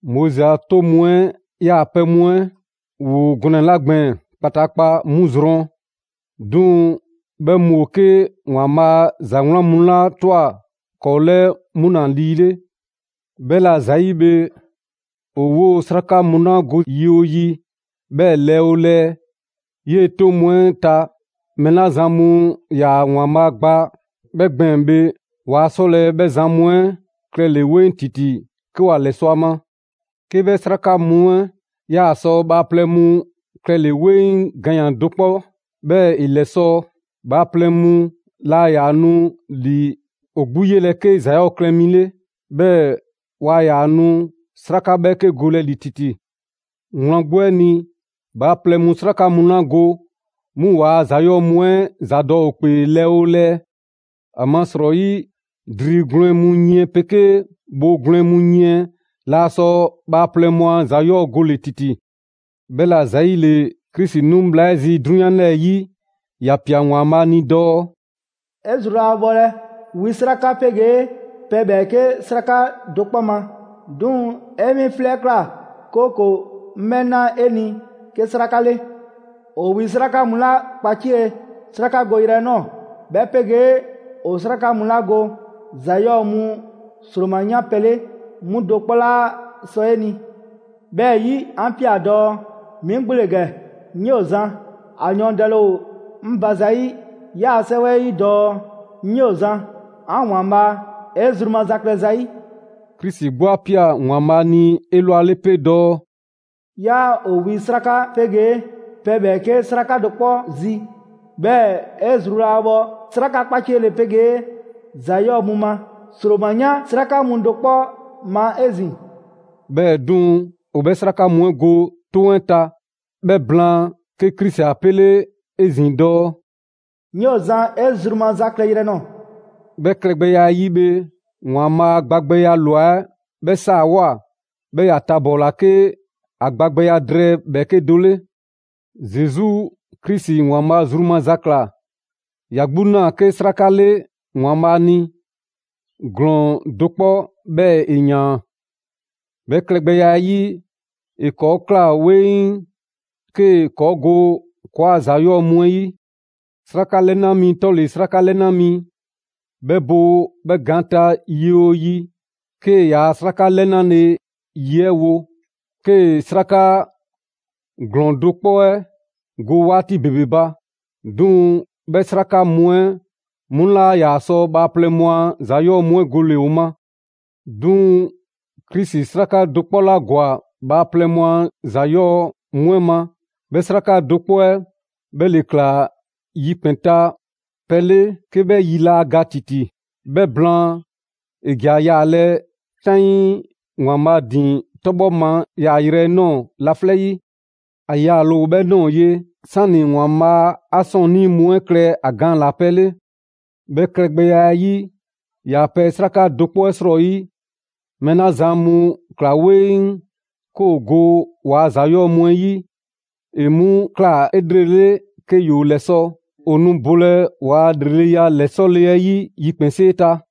Moizi a 'toŋ mu 'ɛ yaa pɛ mu 'ɛ ‑woo gɔnɛ‑ 'la gbɛɛn‑ kpataakpa 'mu zrɔn; 'duŋ‑ 'bhɛ mu ‑o 'ke ‑Waanbhaa' ‑za 'wlan mu 'la ꞊twa ‑kɔɔ' 'lɛɛ, 'mu ‑la lii 'le. 'Bhɛla ‑zayi' bhe, ‑o 'woo‑ 'sraka mu 'la go yi 'oo yi 'bhɛɛ‑ lɛɛ 'oo lɛɛ 'yee‑ 'toŋ mu 'ɛ ta, mɛɛ 'la zan mu ‑yaa ‑Waanbhaa' gba 'bhɛ gbɛɛn‑ bhe, waa 'sɔlɛ‑ 'bhɛ zan mu 'ɛ klɛle‑ 'weŋ ‑titi 'ke ‑wa ‑lɛsɔ' ‑a ma. 'Ke 'bhɛ 'sraka mu 'ɛ 'yaa sɔ bhaaplɛŋ mu klɛle‑ 'weŋ ganyan‑ do 'kpɔ, 'bhɛɛ‑ ‑e ‑lɛsɔ', bhaaplɛŋ mu laa ‑yaa nu ‑li ‑o 'gbu 'yelɛ‑ 'ke ‑za 'yɔɔ‑ klɛ mu 'le. 'Bhɛɛ‑ waa ‑yaa nu 'sraka 'bhɛɛke golɛ ‑li ‑titi. Wlan 'gbu 'ɛ ni, bhaaplɛŋ mu 'sraka mu 'la go, 'mu ‑waa' ‑za 'yɔɔ‑ mu 'ɛ ‑zadɔ' ‑o 'kpee lɛɛ 'oo lɛɛ. ‑Amasrɔyi dri gwlɛn mu yiɛn 'pegee bhoo gwlɛn mu yiɛn laa sɔ bhaaplɛŋ mu a ‑za 'yɔɔ‑ gole‑ ‑titi. 'Bhɛla‑ ‑zayile, Krisi 'nu bhla 'ɛ zi 'drunyan 'lɛɛ‑ 'yi, ‑ya ꞊pia ‑Waanbhaa' ni dɔɔ: «'E zru laa bhɔlɛ wi 'sraka 'pegee pɛ ‑bhɛɛke' 'sraka do 'kpɔ ma; 'duŋ‑ 'e 'mi 'flɛ 'ɛ ꞊kla, 'kooko‑ 'ŋ 'bhɛ na 'e ni 'ke 'sraka 'le. ‑O wi 'sraka mu 'la kpacie 'srakagoyrɛ 'ɛ ꞊nɔɔ, 'bhɛ 'pegee ‑o 'sraka mu 'la go ‑za 'yɔɔ‑ mu ‑sroma 'yan pɛ 'le, 'mu do 'kpɔ 'laa sɔ 'e ni. 'Bhɛɛ‑ 'yi 'an ꞊pia dɔɔ: 'Mi 'gbu ‑le ‑gɛ, 'ŋ 'yoo‑ zan; a yɔɔndɛle ‑o 'ŋ ba ‑zayi' 'yaa‑ 'sɛwɛ 'ɛ 'yi dɔɔ: ‹'Ŋ 'yoo‑ zan, 'an ‑Waanbhaa', 'e zru maza klɛ zayi'.›» Krisi 'gbu 'a ꞊pia ‑Waanbhaa' ni 'elwale 'pe dɔɔ: «'Yaa ‑o wi 'sraka 'pegee pɛ ‑bhɛɛke' 'sraka do 'kpɔ zi; 'bhɛɛ‑ 'e zru laa bhɔ 'sraka 'kpaciele 'pegee ‑za 'yɔɔ‑ mu ma ‑sroma 'yan 'sraka mu do 'kpɔ ma 'ezin‑.» 'Bhɛɛ‑ 'duŋ‑, ‑o 'bhɛ 'sraka mu 'ɛ go 'toŋ 'ɛ ta. 'Bhɛ blaan, 'ke Krisi 'a 'pele 'ezin‑ dɔɔ: «'Ŋ 'yoo‑ zan 'e zru maza klɛyrɛ nɔɔ‑.» 'Bhɛ klɛgbɛya 'ɛ 'yi bhe, ‑Waanbhaa' 'a gbagbɛya ꞊lwa 'ɛ 'bhɛ 'saawoa‑, 'bhɛɛ‑ ‑ya tabɔɔla 'ke ‑a gbagbɛya drɛɛ ‑bhɛɛke' do 'le. Zesu Krisi ‑Waanbhaa' zru maza ꞊kla. ‑Ya 'gbu ꞊naa 'ke 'sraka 'le ‑Waanbhaa' ni, ‑glɔɔn do 'kpɔ 'bhɛɛ‑ ‑e ‑yaan. 'Bhɛ klɛgbɛya 'ɛ 'yi, ‑e ‑kɔɔ' ꞊kla 'weŋ 'kee‑ ‑kɔɔ' go ‑kɔɔa' ‑za 'yɔɔ‑ mu 'ɛ 'yi. 'Sraka 'lɛna mi 'tɔle‑ 'sraka 'lɛna mi, 'bhɛ bo 'bhɛ gaan ta yi 'oo yi 'kee‑ ‑yaa' 'sraka lɛnale ye 'ɛ wo, 'kee‑ 'sraka ‑glɔɔn do 'kpɔ 'ɛ go 'waati ‑bebe ba. 'Duŋ‑ 'bhɛ 'sraka mu 'ɛ 'mu 'laa ‑yaa sɔ bhaaplɛŋ mu a ‑za 'yɔɔ‑ mu 'ɛ gole‑ ‑o ma. 'Duŋ‑ Krisi 'sraka do 'kpɔ ‑la ‑gwa bhaaplɛŋ mu a ‑za 'yɔɔ‑ mu 'ɛ ma. 'Bhɛ 'sraka do 'kpɔ 'ɛ 'bhɛ ‑le ‑kla yikpɛn‑ ta pɛ 'le 'ke 'bhɛ 'yi 'laa ga ‑titi. 'Bhɛ blaan, ‑e ‑ja yaalɛ 'taŋii ‑Waanbhaa' ‑din 'tɔbhɔ ma yaayrɛ 'ɛ ꞊nɔɔ laflɛ' 'yi. ‑A yaale ‑o 'bhɛ ꞊nɔɔ ye, 'sani ‑Waanbhaa' 'a 'sɔɔnnii mu 'ɛ klɛ ‑a gaan ‑la pɛ 'le. 'Bhɛ klɛgbɛya 'ɛ 'yi, ‑yaa' pɛ 'sraka do 'kpɔ 'ɛ 'srɔyi, mɛɛ 'la zan mu ‑kla 'weŋ 'ke ‑o go ‑waa' ‑za 'yɔɔ‑ mu 'ɛ 'yi, ‑e 'mu ꞊kla 'elrele 'ke ‑yoo ‑lɛsɔ'. ‑O nu bolɛ ‑waa' ‑lreleya ‑lɛsɔle 'ɛ 'yi yikpɛnsee ta.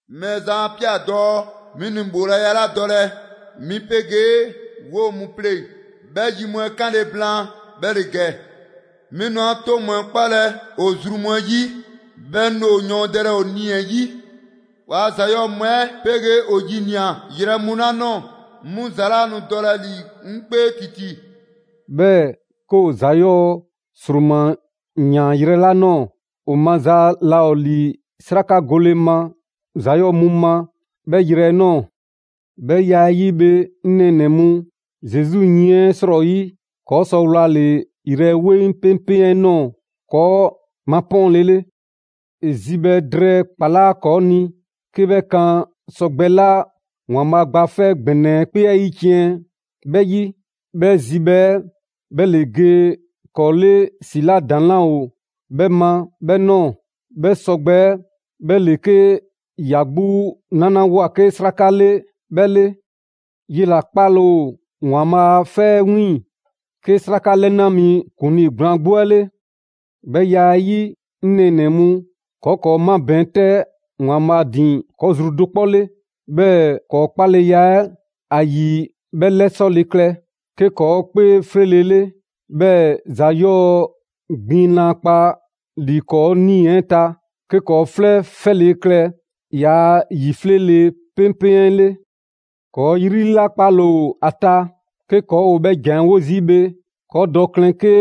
«Mɛɛzan 'a ꞊pia dɔɔ 'mi nu ‑bhoolaya 'la dɔlɛ 'mi 'pegee 'woo‑ mu pleŋ‑, 'bhɛ yi mu 'ɛ 'kanle‑ blaan, 'bhɛ ‑le ‑gɛ: 'Mi nu 'an 'toŋ mu 'ɛ 'kpalɛ ‑o zru mu 'ɛ 'yi; 'bhɛɛ‑ 'ŋ nu ‑o yɔɔndɛlɛ ‑o nii‑ 'ɛ 'yi.» «‑Waa' ‑za 'yɔɔ‑ mu 'ɛ 'pegee ‑o ‑yinia yrɛ mu 'la ꞊nɔɔ, 'mu ‑za 'laa nu dɔlɛ ‑li 'ŋ 'kpee ‑titi.» 'Bhɛɛ‑ 'ke ‑o ‑za 'yɔɔ‑ ‑sroma ‑yaan yrɛ 'la ꞊nɔɔ, ‑o maza laa ‑o ‑li 'sraka gole ma ‑za 'yɔɔ‑ mu ma 'bhɛ 'yrɛ 'ɛ ꞊nɔɔ. 'Bhɛ ya 'ɛ 'yi bhe 'ŋ nɛɛnɛ‑ mu, Zesu yiɛn 'ɛ 'srɔyi, ‑kɔɔ' sɔ wlale‑ yrɛ 'weŋ 'peŋpeŋ 'ɛ ꞊nɔɔ ‑kɔɔ' mapɔɔnle 'le. ‑E zibhɛ drɛɛ ‑kpalaa' ‑kɔɔ' ni 'ke 'bhɛ kan sɔgbɛ 'la ‑Waanbhaa' Gba 'Fɛ ‑Gbɛnɛ 'ɛ 'kpee 'ɛ 'yiciɛn‑ 'bhɛ 'yi. 'Bhɛ zibhɛ 'ɛ 'bhɛ ‑le ge ‑kɔɔ' 'le ‑si 'la ‑daŋ' 'laa ‑o 'bhɛ ma 'bhɛ ꞊nɔɔ. 'Bhɛ sɔgbɛ 'ɛ 'bhɛ ‑le 'ke ‑ya 'gbu 'nalawoa 'ke 'sraka 'le 'bhɛ 'le. 'Yela‑ 'kpale‑ ‑o ‑Waanbhaa' a 'fɛ 'ɛ 'wiiŋ‑ 'ke 'sraka 'lɛna mi ‑kuŋlii gblaan 'gbu 'ɛ 'le. 'Bhɛ ya 'ɛ 'yi, 'ŋ nɛɛnɛ‑ mu, ‑kɔɔ' ‑kɔɔ' 'mabɛɛn‑ 'tɛ ‑Waanbhaa' ‑din ‑kɔɔ' zru do 'kpɔ 'le, 'bhɛɛ‑ ‑kɔɔ' 'kpaleya 'ɛ ‑a ‑yi 'bhɛ 'lɛsɔle klɛ; 'ke ‑kɔɔ' 'kpee 'fleele‑ 'le, 'bhɛɛ‑ ‑za 'yɔɔ‑ gbiŋ laa kpa ‑li ‑kɔɔ' 'nii‑ 'ɛ ta, 'ke ‑kɔɔ' 'flɛ 'fɛle‑ klɛ ‑yaa' ‑yi 'fleele‑ 'peŋpeŋ 'ɛ 'le. ‑Kɔɔ' 'yri 'la 'kpale‑ ‑o ‑a ta, 'ke ‑kɔɔ' ‑o 'bhɛ ‑jan 'ɛ 'wo zii' bhe, ‑kɔɔ' dɔ klɛn 'ke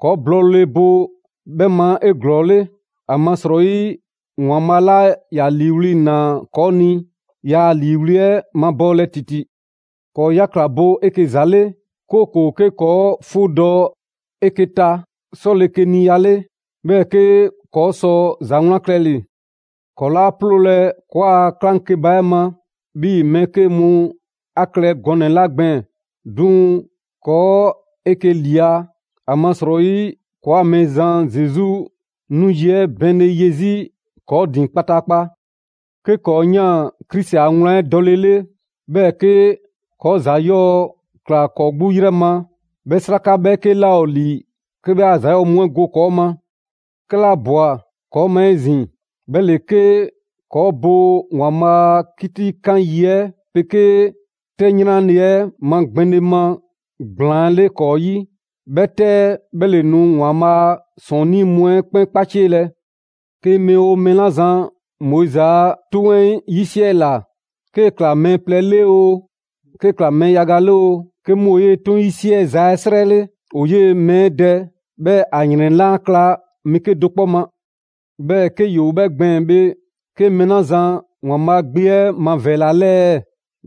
‑kɔɔ' blɔɔle bo 'bhɛ ma 'eglɔɔle. ‑Amasrɔyi ‑Waanbhaa' 'la ‑ya ‑liiwli' ‑naa ‑kɔɔ' ni, yaa a ‑liiwli' 'ɛ mabɔɔlɛ ‑titi. ‑Kɔɔ' 'yakla‑ bo 'eke‑ ‑za 'le, 'kooko‑ 'ke 'kɔɔ‑ 'fuudɔ‑ 'eke‑ ta 'sɔlekeniya 'le, 'bhɛɛ‑ 'ke ‑kɔɔ' sɔ ‑za 'wlan klɛle‑. ‑Kɔɔ' 'laa 'ploolɛ‑ ‑kɔɔa' 'klaŋkeba 'ɛ ma, 'bhii‑ mɛɛ 'ke mu a klɛ gɔnɛ‑ 'la gbɛɛn‑. 'Duŋ‑ ‑kɔɔ' 'eke‑ ꞊lia; ‑amasrɔyi ‑kɔɔ' ‑o Mɛɛzan Zesu 'nu yi 'ɛ bɛɛnle ye 'zi ‑kɔɔ' ‑din kpataakpa. 'Ke 'kɔɔ‑ ꞊yaan Krisi a wlan 'ɛ dɔlele, 'bhɛɛ‑ 'ke ‑kɔɔ' ‑za 'yɔɔ‑ ꞊kla ‑kɔɔ' 'gbu 'yrɛ ma, 'bhɛ 'sraka 'bhɛɛke 'laa ‑o ‑li 'ke 'bhɛ ‑kɔɔ' 'a ‑za 'yɔɔ‑ mu 'ɛ go ‑kɔɔ' ma. 'Kɛla ꞊bwa ‑kɔɔ' ma 'ezin‑, 'bhɛ ‑le 'ke ‑kɔɔ' bo ‑Waanbhaa' a 'kitikan yi 'ɛ 'pegee 'tɛ 'yranle‑ 'ɛ 'magbɛnle ma ‑gblaan 'le ‑kɔɔ' 'yi. 'Bhɛ 'tɛ 'ɛ 'bhɛ ‑le nu ‑Waanbhaa' ‑sɔɔnnii' mu 'ɛ 'kpɛn 'kpacielɛ. 'Ke mɛɛ 'oo mɛɛ 'la zan Moizi a 'Toŋ 'ɛ 'yisiɛla, 'kee‑ ꞊kla mɛɛ plɛ le oo, 'kee‑ ꞊kla mɛɛ yaga 'le oo, 'ke 'mu ‑o 'yee‑ 'toŋ 'yisiɛza 'ɛ 'srɛ 'le, ‑o 'yee‑ mɛɛ 'ɛ dɛ, 'bhɛɛ‑ ‑a ‑yrɛn 'laa kla mɛɛ 'kedo‑ 'kpɔ ma. 'Bhɛɛ‑ 'ke ‑yoo 'bhɛ gbɛɛn‑ bhe, 'ke mɛɛ 'la zan ‑Waanbhaa' Gbe 'ɛ mavɛɛla 'lɛɛ‑ ɛɛ?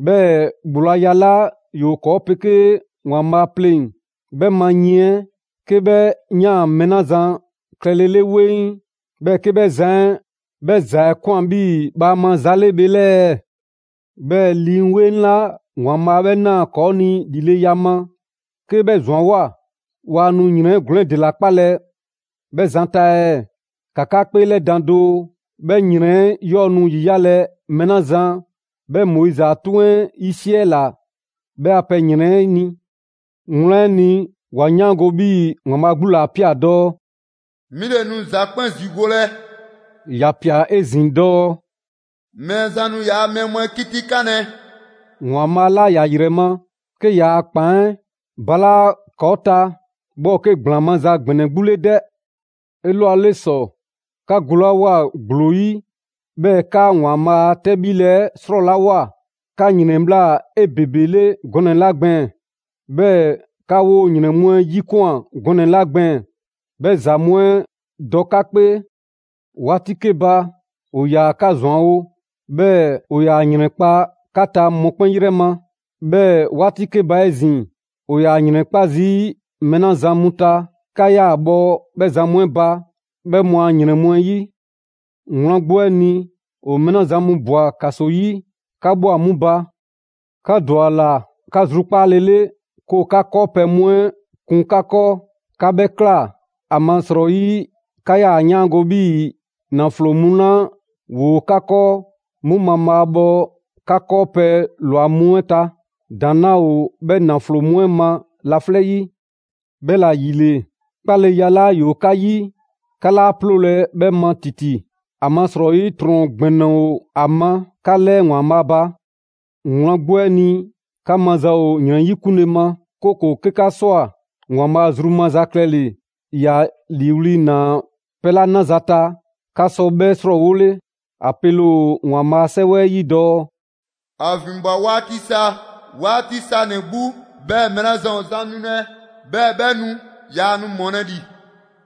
'Bhɛɛ‑ ‑bhoolaya 'la ‑yoo ‑kɔɔ' 'pegee ‑Waanbhaa' pleŋ‑ 'bhɛ ma yiɛn 'ɛ, 'ke 'bhɛ ꞊yaan mɛɛ 'la zan klɛlele 'weŋ, 'bhɛɛ‑ 'ke 'bhɛ zan 'ɛ 'bhɛ ‑za 'ɛ ꞊kwan 'bhii‑ bhaama za 'le bhe 'lɛɛ‑ ɛɛ? 'Bhɛɛ‑ Lii 'Weŋ 'la ‑Waanbhaa' 'bhɛ ꞊naa ‑kɔɔ' ni ‑lileya ma, 'kee‑ 'bhɛ ‑zwanwoa, waa nu ‑yrɛn ‑glɔɔn 'ɛ ‑dela 'kpalɛ‑ 'bhɛ zan ta ɛɛ? ‑Ka 'ka 'kpeelɛdan doo, 'bhɛ ‑yrɛn 'yɔɔ‑ nu ‑yiyalɛ mɛɛ 'la zan 'bhɛ Moizi a 'toŋ 'ɛ 'yisiɛla 'bhɛ a pɛ ‑yrɛn 'ɛ ni. Wlan 'ɛ ni, 'wa 'yaango‑ 'bhii‑ ‑Waanbhaa' 'gbu ‑le 'a ꞊pia dɔɔ: «'Mi ‑le nu ‑za 'kpɛn ‑zigolɛ.» ‑Ya ꞊pia 'ezin‑ dɔɔ: «Mɛɛzan nu ‑yaa' mɛɛ mu 'ɛ 'kitikanlɛ.» ‑Waanbhaa' 'la ‑ya ‑yrɛ ma, 'ke ‑yaa' ‑kpan 'ɛ ‑balaa' ‑kɔɔ' ta 'bhɛ ‑o 'ke ‑gblaan maza ‑gbɛnɛ 'gbu 'le 'dɛ! 'Elwale ‑sɔ, 'ka golawoa ‑gblo 'yi, 'bhɛɛ‑ 'ka ‑Waanbhaa' a 'tɛbhile 'ɛ 'srɔlawoa, 'ka ‑yrɛnbhla 'ebebele gɔnɛ‑ 'la gbɛɛn‑, 'bhɛɛ‑ 'ka 'woo‑ ‑yrɛn mu 'ɛ ‑yikwan gɔnɛ‑ 'la gbɛɛn‑, 'bhɛ ‑za mu 'ɛ dɔ 'ka 'kpee. 'Waati 'ke ba, ‑o ‑yaa 'ka ‑zwanwo', 'bhɛɛ‑ ‑o ‑yaa ‑yrɛnkpa' 'ka ta mɔkpɛn' 'yrɛ ma. 'Bhɛɛ‑ 'waati 'ke ba 'ezin‑, ‑o ‑yaa ‑yrɛnkpa' zii' mɛɛ 'la zan mu ta, 'ka 'yaa‑ bhɔ 'bhɛ zan mu 'ɛ ba 'bhɛ mu a ‑yrɛn mu 'ɛ 'yi. Wlan 'gbu 'ɛ ni, ‑o mɛɛ 'la zan mu ꞊bwa ‑kaso 'yi, 'ka ꞊bhwa 'mu ba. 'Ka ‑dwa ‑a ꞊la 'ka zrukpaale 'le 'ke ‑o 'ka 'kɔɔpɛ‑ mu 'ɛ kun 'ka 'kɔɔ. 'Ka 'bhɛ ꞊kla, ‑amasrɔyi 'ka 'yaa‑ 'yaango‑ 'bhii‑ ‑naflo mu 'la ‑woo 'ka 'kɔɔ, 'mu mabhaabhɔ 'ka 'kɔɔpɛ‑ ꞊lwa mu 'ɛ ta. ‑Daŋ' 'laa ‑o 'bhɛ ‑naflo mu 'ɛ ma laflɛ' 'yi. 'Bhɛla‑ ‑yile, 'kpaleya 'la ‑yoo 'ka 'yi, 'ka 'laa 'ploolɛ‑ 'bhɛ ma ‑titi. ‑Amasrɔyi ‑trɔn ‑gbɛnɛ ‑o ‑a ma 'ka 'lɛɛ ‑Waanbhaa' ba. Wlan 'gbu 'ɛ ni, 'ka maza ‑o ‑yrɛn 'yikunle ma, 'kooko‑ 'ke 'ka ꞊swa ‑Waanbhaa' zru maza klɛle‑, ‑ya ‑liiwli' ꞊naa pɛ 'la 'naza‑ ta, 'ka sɔ 'bhɛ 'srɔɔwole. ‑A pele ‑o ‑Waanbhaa' 'Sɛwɛ 'ɛ 'yi dɔɔ: «‑A ‑vinbwa 'waati sa, 'waati sanɛ‑ 'gbu, 'bhɛɛ‑ mɛɛ 'la zan ‑o zan nulɛ 'bhɛɛ‑ 'bhɛ nu. Yaa nu ‑mɔlɛ' ‑li.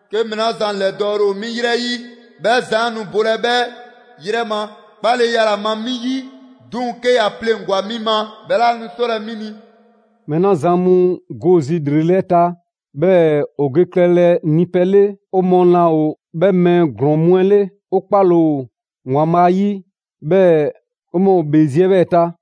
'Ke mɛɛ 'la zan ‑lɛdɔɔle ‑o 'mi 'yrɛ 'yi, 'bhɛ zan 'ɛ nu bolɛ 'bhɛ 'yrɛ ma 'kpaleya ‑la ma 'mi 'yi. 'Duŋ‑ 'ke ‑ya pleŋgwa‑ 'mi ma, 'bhɛ 'laa nu 'sɔlɛ‑ 'mi ni.» Mɛɛ 'la zan mu go zi ‑lrele' 'ɛ ta, 'bhɛɛ‑ ‑o ge klɛlɛ ni pɛ 'le, 'o mɔɔ laa ‑o 'bhɛ mɛɛ ‑glɔɔn mu 'ɛ 'le. 'O 'kpale‑ ‑o ‑Waanbhaa' 'yi, 'bhɛɛ‑ 'o mɔɔ ‑o ‑bhee zi 'ɛ 'bhɛɛ‑ ta.